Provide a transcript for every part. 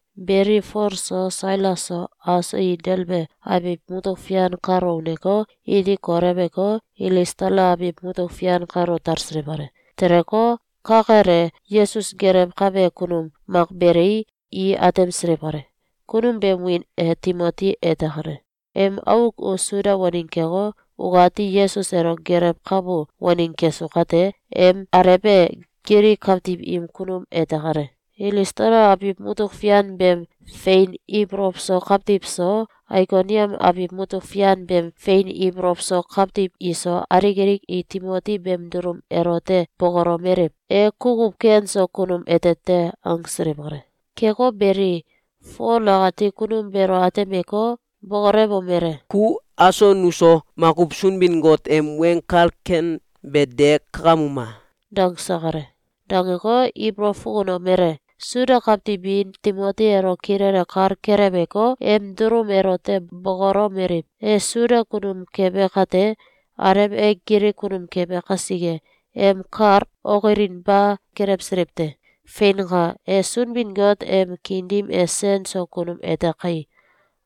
Beli, Fol so, Sailas so, aso i Delbe abiw mutuk fian kalo uneko, iti koleweko, Ilistala abiw mutuk fian kalo talsiliw kale. Teleko, ka kel e, Yesus gelewkabe kunum mak belei, i atemsiliw kale. Kunum beem wiin e Timoti ete kale. Em auk u Suda waneng keko, ukati Yesus elo gelewkabu waneng kesu kate, em alew e Gilik kawtiw im kunum ete kale. Ilistala abiw mutuk fian beem fein ibolow so kawtiw so, Aikoniam abiw mutuk fian beem fein ibolow so kawtiw iso, alik alik i Timoti beem dulum elote bokolomeliw: “E kukuw ken so kunum ete te!”, angsiliw kale. Keko beli, Fol akati kunum beelo atemeko, bokolewomele: “Ku aso nuso makuw Sunbin-Got em Weng Kal ken be de kakamuma!”, dangse kale. Dangeko, ibolow fukunomele: Suda kawtiw bi Timoti elo kilele kal keleweko, em dulum elote bokolomeliw: ‘E Suda kunum kebe kate, alew e Gilik kunum kebe kasike, em kal okilinba kelewsiliw te. Feinka! E Sunbin-Got em kiin dim e sen so kunum ete kai!’,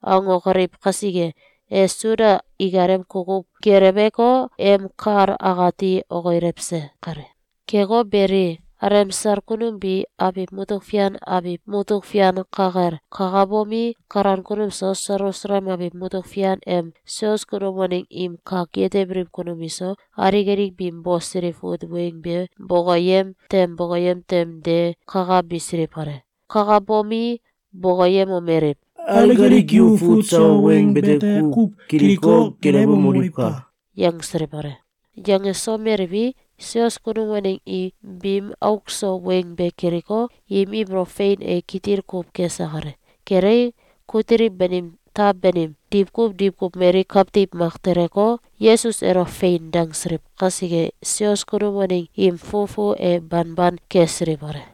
angokoliw kasike, e Suda ikalem kukuw geleweko, em kal akati okilewse kale. Keko beli, alemsal kunum bi abiw mutuk fian abiw mutuk fian ka kel kakabomi, kalan kunum so, Selusalem abiw mutuk fian em sios kunum waneng im kak yetebiliw kunum iso, alik alik biim bosiliw fut weng be bokoyem tem bokoyem tem de kakabisiliw kale. Kakabomi, bokoyemomeliw: “Alik alik yu fut sawa weng bete kuw kiliko, gelewemoliwka!”, yangsiliw kale. Yangesomeliwi, sios kunum waneng i biim auk so weng be kiliko, im ibolow fein e kitil kuw kese kale. Kelei, kutiliw banim taw banim, diwkuw diwkuw mali kawtiw mak teleko, Yesus elo “Fein!”, dangsiliw kasike, sios kunum waneng im fufu e banban kesiliw kale.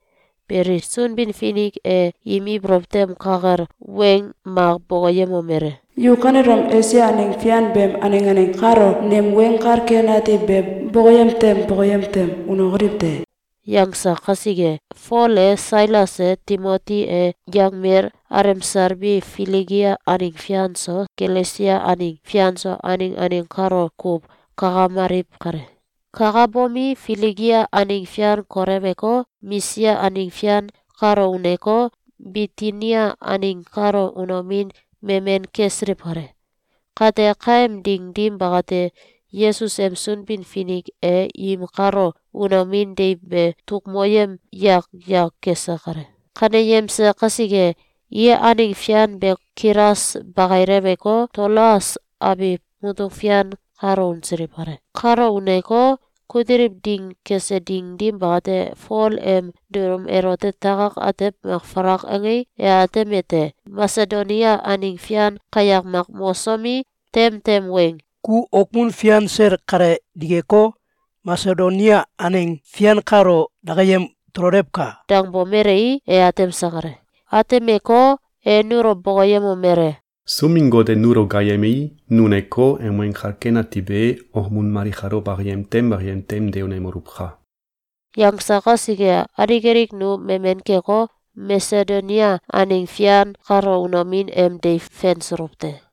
Beli, Sunbin-Finik e im ibolow tem ka kel weng mak bokoyemomele: “Yu kanelom Esia aneng fian beem aneng aneng kalo nem Weng Kal Ken Ati be bokoyem tem bokoyem tem unokoliw te!”, yangse kasike, Fol e, Sailas e, Timoti e, yangmel alemsal bi Filigia aneng fian so, Galesia aneng fian so, aneng aneng kalo kuw kakamaliw kale. Kakabomi, Filigia aneng fian koleweko, Misia aneng fian kalo uneko, Bitinia aneng kalo unomin memen kesiliw kale. Kate, kaem ding dim bakate, Yesus em Sunbin-Finik e im kalo unomin deiw be tuk moyem yak yak kese kale. Kaneyemse kasike, i aneng fian be kilas bakileweko, Toloas abiw mutuk fian kalo unsiliw kale. Kalo uneko, kutiliw ding kese ding dim bakate, Fol em dulum elote takak atew mak falak angei, e atemete: Masedonia aneng fian kayak mak mosomi, tem tem weng “Ku okmun fian sel kale dikeko, Masedonia aneng fian kalo dakayem tololewka!”, dangbomelei, e atemse kale. Atemeko, e nulo bokoyemomele: “Sunbin-Got e nulo gaayemei, nu uneko, em Weng Kal Ken Ati be okmun mali kalo bakayem tem bakayem tem de unemoluwka!”, yangse kasike, alik alik nu memen keko, Masedonia aneng fian kalo unomin em deiw fensuluw te.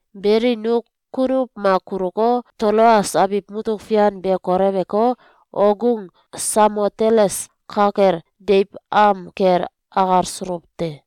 Beli, nu kunuw mak kuluko, Toloas abiw mutuk fian be koleweko, okgung Samoteles ka kel deiw am kel akalsuluw te.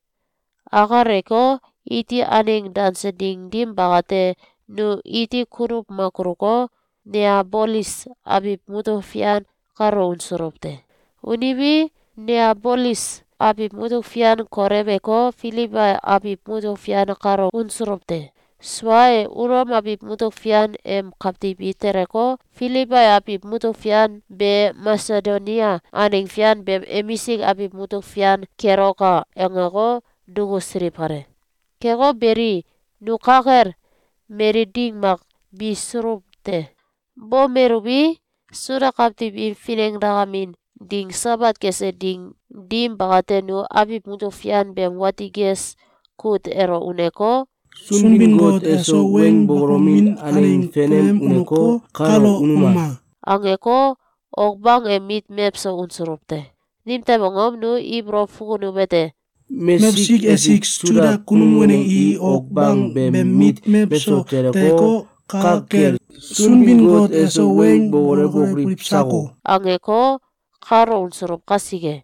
Akaleko, iti aneng danse ding dim bakate, nu iti kunuw mak kuluko, Neabolis abiw mutuk fian kalo unsuluw te. Unuwi, Neabolis abiw mutuk fian koleweko, Filibai abiw mutuk fian kalo unsulw te. Sua e, Ulom abiw mutuk fian em kawtiw i teleko, “Filibai abiw mutuk fian be, Masedonia aneng fian beem emisik abiw mutuk fian keloka!”, angeko, dukusiliw kale. Keko beli, nu ka kel mali ding mak bisuluw te. Bomeluwi, Suda kawtiw im finengdakemin ding Sabat kese ding dim bakate, nu abiw mutuk fian beem wati ges kut elo uneko, “Sunbin-Got eso weng bokolomin aneng fenem uneko, kalo unuma!”, angeko, ok bang em mit mewso unsuluw te. Nimtew angom? Nu ibolow fukunuwete: “Mesik esik Suda kunum waneng i ok bang beem mit mewso teleko, ka kel Sunbin-Got eso weng bokolewokoliw sako!”, angeko, kalo unsuluw kasike.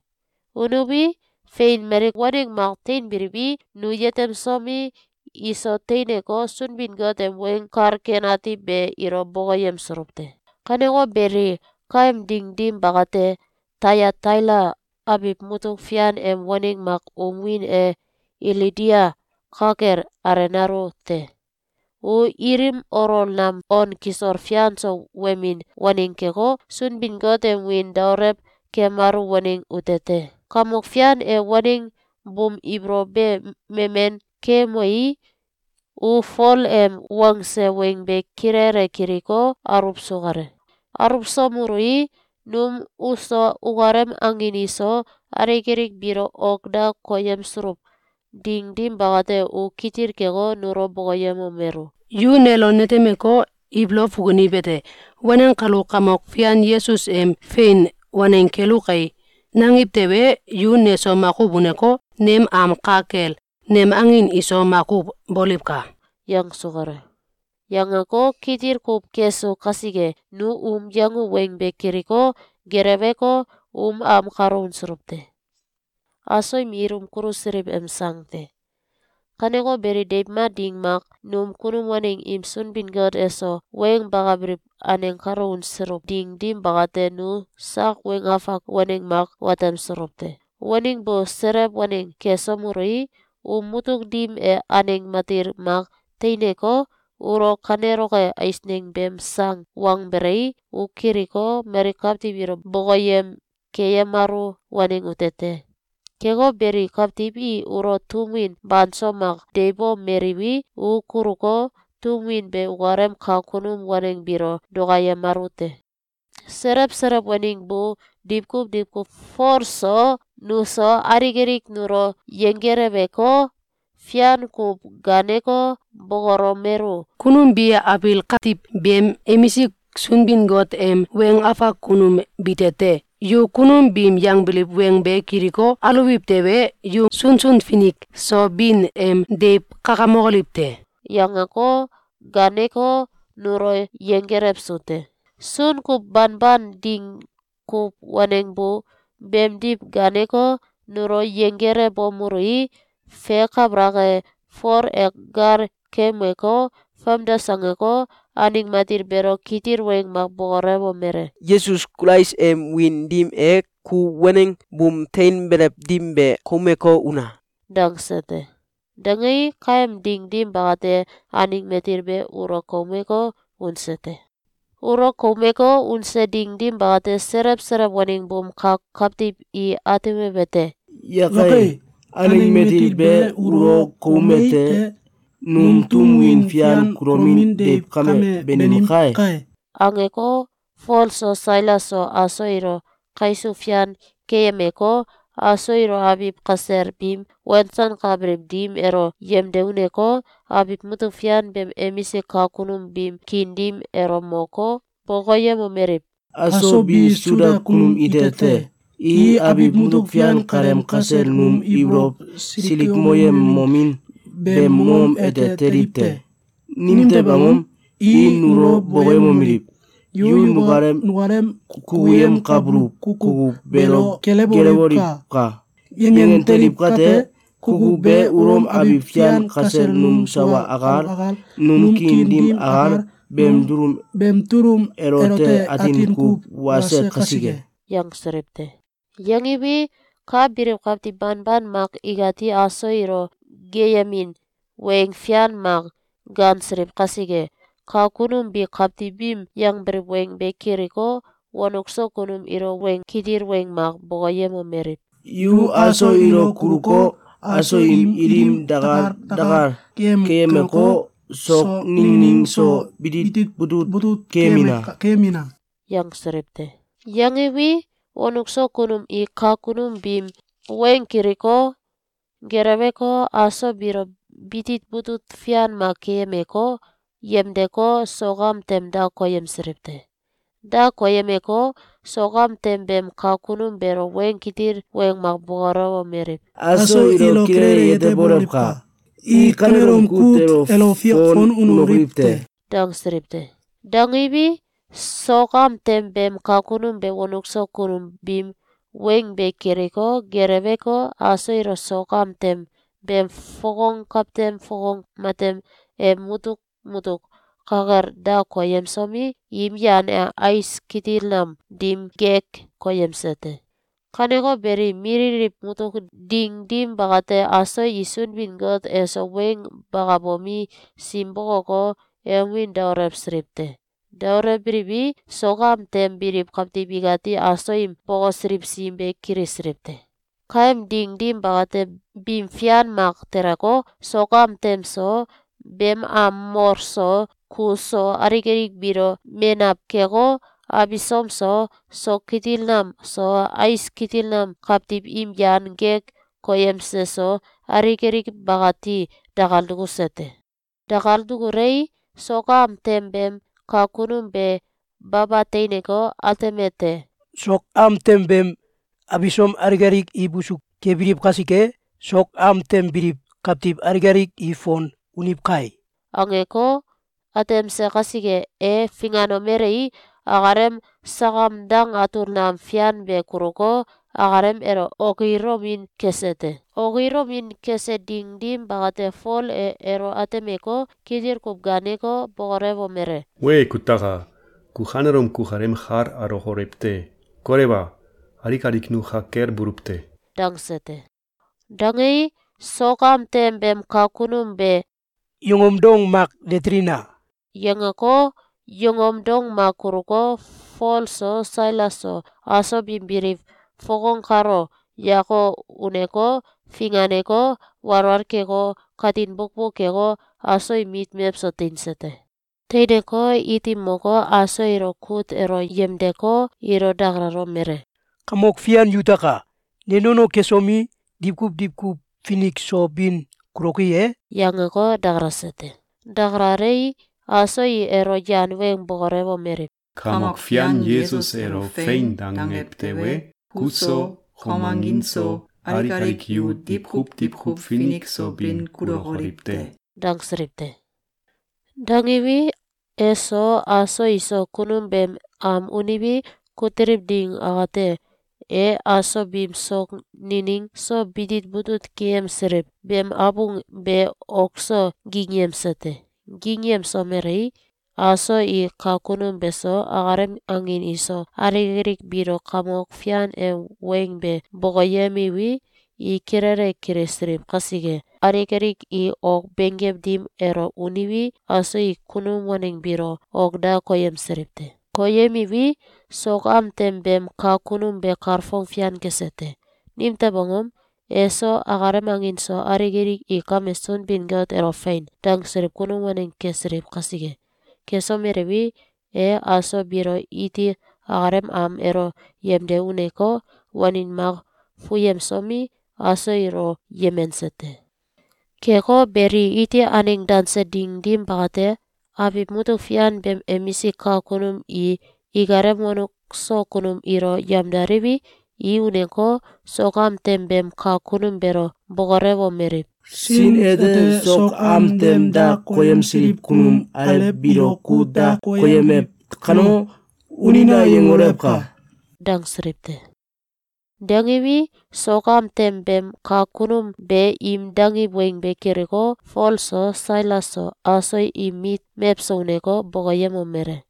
Unuwi, fein, mali waneng mak tein biliwi, nu yetemsomi, iso teineko, Sunbin-Got em Weng Kal Ken Ati be ilo bokoyemsuluw te. Kaneko beli, kaem ding dim bakate, Tayataila abiw mutuk fian em waneng mak um wiin e Ilidia ka kel alenalu te. U ilim olol nam on kisol fian so wemin waneng keko, Sunbin-Got em wiin daolew kemalu waneng ute te. Kamok Fian e waneng buum ibolow be memen keumei, u Fol em wangse weng be kilele kiliko, aluwsu kale. Aluwsomelui, num uso ukalem angin iso, alik alik biilo ok da koyemsuluw ding dim bakate, u kitil keko, nulo bokoyemomelu: “Yu nelo netemeko, ibolow fukuniwete: ‘Waneng kalu Kamok Fian Yesus em fein waneng kelu kai!’, nangiw tewe, yu neso makuw uneko, nem am ka kel nem angin iso makuw boliwka!”, yangsu kale. Yangeko, kitil kuw kesu kasike, nu um yangu weng be kiliko, geleweko, um am kalo unsuluw te. im Ilum Kulusiliw em Sang te. Kaneko beli, deiw mak ding mak, num kunum waneng im Sunbin-Got eso weng bakabiliw aneng kalo unsuluw ding dim bakate, nu sak weng afak waneng mak watemsuluw te. Waneng bu selew waneng kesomelui, um mutuk dim e aneng matil mak teineko, ulo kaneloke eisneng beem sang wangbelei, u kiliko, mali kawtiw ilo bokoyem keyemalu waneng ute te. Keko beli, kawtiw i ulo tum win banso mak deiwbomeliwi, u kuluko, tum win be ukalem kak kunum waneng biilo dukayemalu te. Selew selew waneng bu diwkuw diwkuw Folo so, nuso, alik alik nulo yenggeleweko, fian kuw gaaneko, bokolomelu: “Kunum bi abiil katiw beem emisik Sunbin-Got em weng afak kunum bite te! Yu kunum biim yangbiliw weng be kiliko, aluwiw tewe, yu sunsun finik so bin em deiw kakamokoliw te!”, yangeko, gaaneko, nulo yenggelewsu te. Sun kuw banban ding kuw waneng bu beemdiw gaaneko, nulo yenggelewbomelui, fe kabalak e, Fol e gal keumeko, famdes angeko, aneng matil beelo kitil weng mak bokolewomele: “Yesus Kulais em wiin dim e, ku waneng buum teinbelew dim be koumeko, una!”, dangse te. Dangei, kaem ding dim bakate, aneng matil be ulo koumeko, unse te. Ulo koumeko, unse ding dim bakate, selew selew waneng buum kak kawtiw i atemiwete: “Yakai! Aneng matil be ulo koume te! Num tum win fian kulomin deiw kame banim kai!”, angeko, Fol so, Sailas so, aso ilo kaisuw fian keyemeko, aso ilo abiw kasel biim wensankabiliw dim elo yemde uneko, abiw mutuk fian beem emisik kak kunum biim kiin dim elo moko, bokoyemomeliw: “Aso bi Suda kunum ite te. I abiw mutuk fian kaleem kasel num ibolow silikmoyemomin beem mongom ete teliw te. Nimtew angom? I nulo bokoyemomeliw: ‘Yu nukalem kukuyemkabuluw kukuw beelo gelewoliwka!’, yangen teliw kate, kukuw be Ulom abiw fian kasel num sawa akal, num kiin dim akal, beem dulum elote atin kuw wase kasike.”, yangsiliw te. Yangiwi, ka biliw kawtiw banban mak ikati aso ilo geeyemin weng fian mak gaansiliw kasike, kak kunum bi kawtiw biim yangbiliw weng be kiliko, wonuk so kunum ilo weng kitil weng mak bokoyemomeliw: “Yu aso ilo kuluko, aso im ilim dakal dakal keyemeko, sok ningning so bitit butut keyemina!”, yangsiliw te. Yangiwi, wonuk so kunum i kak kunum biim weng kiliko, geleweko, aso biilo bitit butut fian mak keyemeko, yemdeko, sok am tem da koyemsiliw te. Da koyemeko, sok am tem beem kak kunum beelo weng kitil weng mak bokolewomeliw: “Aso ilo kilele yetebolewka! I kanelom kut elo fon unokoliw te!”, dangsiliw te. Dangiwi, sok am tem beem kak kunum be wonuk so kunum biim weng be kiliko, geleweko, aso ilo sok am tem beem fokong kawtem fokong matem em mutuk mutuk ka kel da koyemsomi, im yan e ais kitil nam dim gek koyemse te. Kaneko beli, mililiw mutuk ding dim bakate, aso i Sunbin-Got eso weng bakabomi, sim bokoko, em wiin daolewsiliw te. Daolewbiliwi, sok am tem biliw kawtiw ikati aso im bokosiliw sim be kilisiliw te. Kaem ding dim bakate, bim fian mak teleko, sok am tem so, beem am mol so, kus so, alik alik biilo menaw keko, abisom so, sok kitil nam so, ais kitil nam kawtiw im yan gek koyemse so, alik alik bakati dakal dukuse te. Dakal dukulei, sok am tem beem kak kunum be baba teineko, atemete: “Sok am tem beem abisom alik alik i busu kembiliw kasike, sok am tem biliw kawtiw alik alik i fon uniw kai!”, angeko, atemse kasike, e finganomelei, akalem sakam dang atul nam fian be kuluko, akalem elo okilomin kese te. Okilomin kese ding dim bakate, Fol e elo atemeko, kitil kuw gaaneko, bokolewomele: “Wee, kutaka! Ku kanelom kukalem kal alokolew te! Kolewa! Alik alik nu ka kel buluw te!”, dangse te. Dangei, sok am tem beem kak kunum be “Yongom dong mak de telina!”, yangeko, yongom dong mak kuluko, Fol so, Sailas so, aso biim biliw fokong kalo yako uneko, finganeko, walwal keko, katin bukbuk keko, aso im mit mewso teinse te. Teineko, iti moko, aso ilo kut elo yemdeko, ilo dakalomele: “Kamok fian yutaka! Ne nono kesomi, diwkuw diwkuw finik so bin kuloki e?”, yangeko, dakalase te. Dakalalei, aso i elo yan weng bokolewomeliw: “Kamok Fian Yesus elo ‘Fein!’, dangew tewe, ku so, kom angin so, alik alik yu diwkuw diwkuw finik so bin kulokoliw te!”, dangsiliw te. Dangiwi, eso, aso iso kunum beem am uniwi, kutiliw ding akate, e aso biim sok nining so bitit butut keyemsiliw beem abung be ok so gingyemse te. Gingyemsomelei, aso i kak kunum beso, akalem angin iso, alik alik biilo Kamok Fian em weng be bokoyemiwi, i kilele kilisiliw kasike, alik alik i ok benggew dim elo uniwi, aso i kunum waneng biilo ok da koyemsiliw te. Koyemiwi, sok am tem beem kak kunum be kalfong fian kese te. Nimtew angom? Eso akalem angin so alik alik i kame Sunbin-Got elo “Fein!”, dangsiliw kunum waneng kesiliw kasike. Kesomeliwi, e aso biilo iti akalem am elo yemde uneko, wanin mak fuyemsomi, aso ilo yemense te. Keko beli, iti aneng danse ding dim bakate, abiw mutuk fian beem emisik kak kunum i ikalem wonuk so kunum ilo yamdaliwi, i uneko, sok am tem beem kak kunum beelo bokolewomeliw: “Sin ete sok am tem da koyemsiliw kunum alew biilo kut da koyemew kano, ‘Unina!’, yangolewka!”, dangsiliw te. Dangiwi, sok am tem beem kak kunum be im dangiw weng be kiliko, Fol so, Sailas so, aso im mit mewso uneko, bokoyemomele: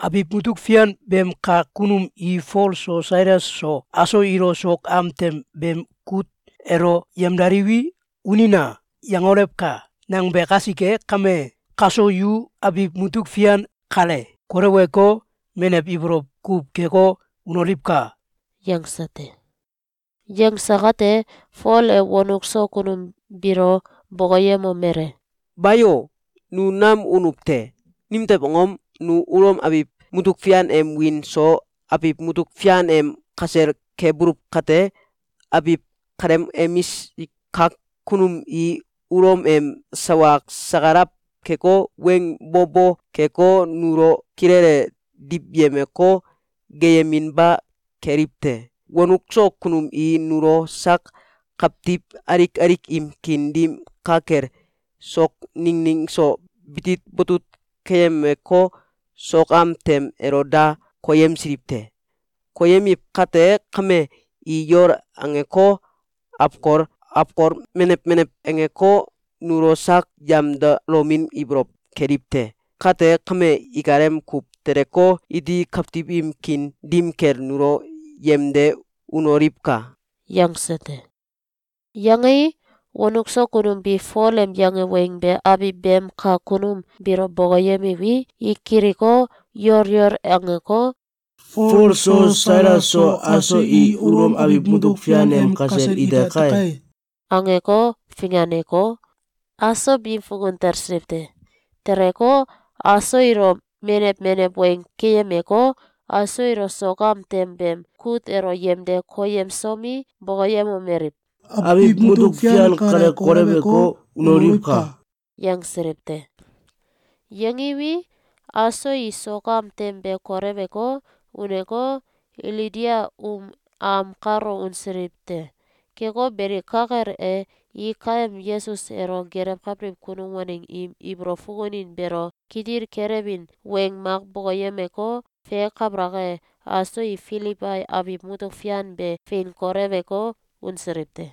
“Abiw mutuk fian beem kak kunum i ‘Fol so, Sailas so, aso ilo sok am tem beem kut elo yemdaliwi, ‘Unina!’, yangolewka!’, nangbe kasike kame, kaso yu abiw mutuk fian kale koleweko, menew ibolow kuw keko, unoliwka!”, yangse te. Yangse kate, Fol e wonuk so kunum biilo bokoyemomele: “Bayo! Nu nam unuw te! Nimtew angom? Nu Ulom abiw mutuk fian em wiin so abiw mutuk fian em kasel kebuluw kate, abiw kaleem emisk kak kunum i Ulom em sawa sakalaw keko, weng bo bo keko, nulo kilele diwyemeko, geeyeminba keliw te. Wonuk so kunum i nulo sak kawtiw alik alik im kiin dim ka kel sok ningning so bitit butut keyemeko, sok am tem elo da koyemsiliw te. Koyemiw kate kame, i yol angeko, awkol awkol menew menew angeko, nulo sak yamdalomin ibolow keliw te. Kate kame, ikalem kuw teleko, iti kawtiw im kiin dim kel nulo yemde unoliwka!”, yangse te. Yangei, wonuk so kunum bi Fol em yange weng be abiw beem kak kunum biilo bokoyemiwi, i kiliko, yol yol angeko, “Fol so Sailas so, aso i Ulom abiw mutuk fian em kasel ite kai!”, angeko, finganeko, aso biim fukun talsiliw te. Teleko, aso ilo menew menew weng keyemeko, aso ilo sok am tem beem kut elo yemde koyemsomi, bokoyemomeliw: “Abiw mutuk fian kale koleweko, unoliwka!”, yangsiliw te. Yangiwi, aso i sok am tem be koleweko, uneko, Ilidia um am kalo unsiliw te. Keko beli, ka kel e, i kaem Yesus elo gelewkabiliw kunum waneng im ibolow fukunin beelo kitil kelewin weng mak bokoyemeko, fe kabalak e, aso i Filibai abiw mutuk fian be fein koleweko, unsiliw te.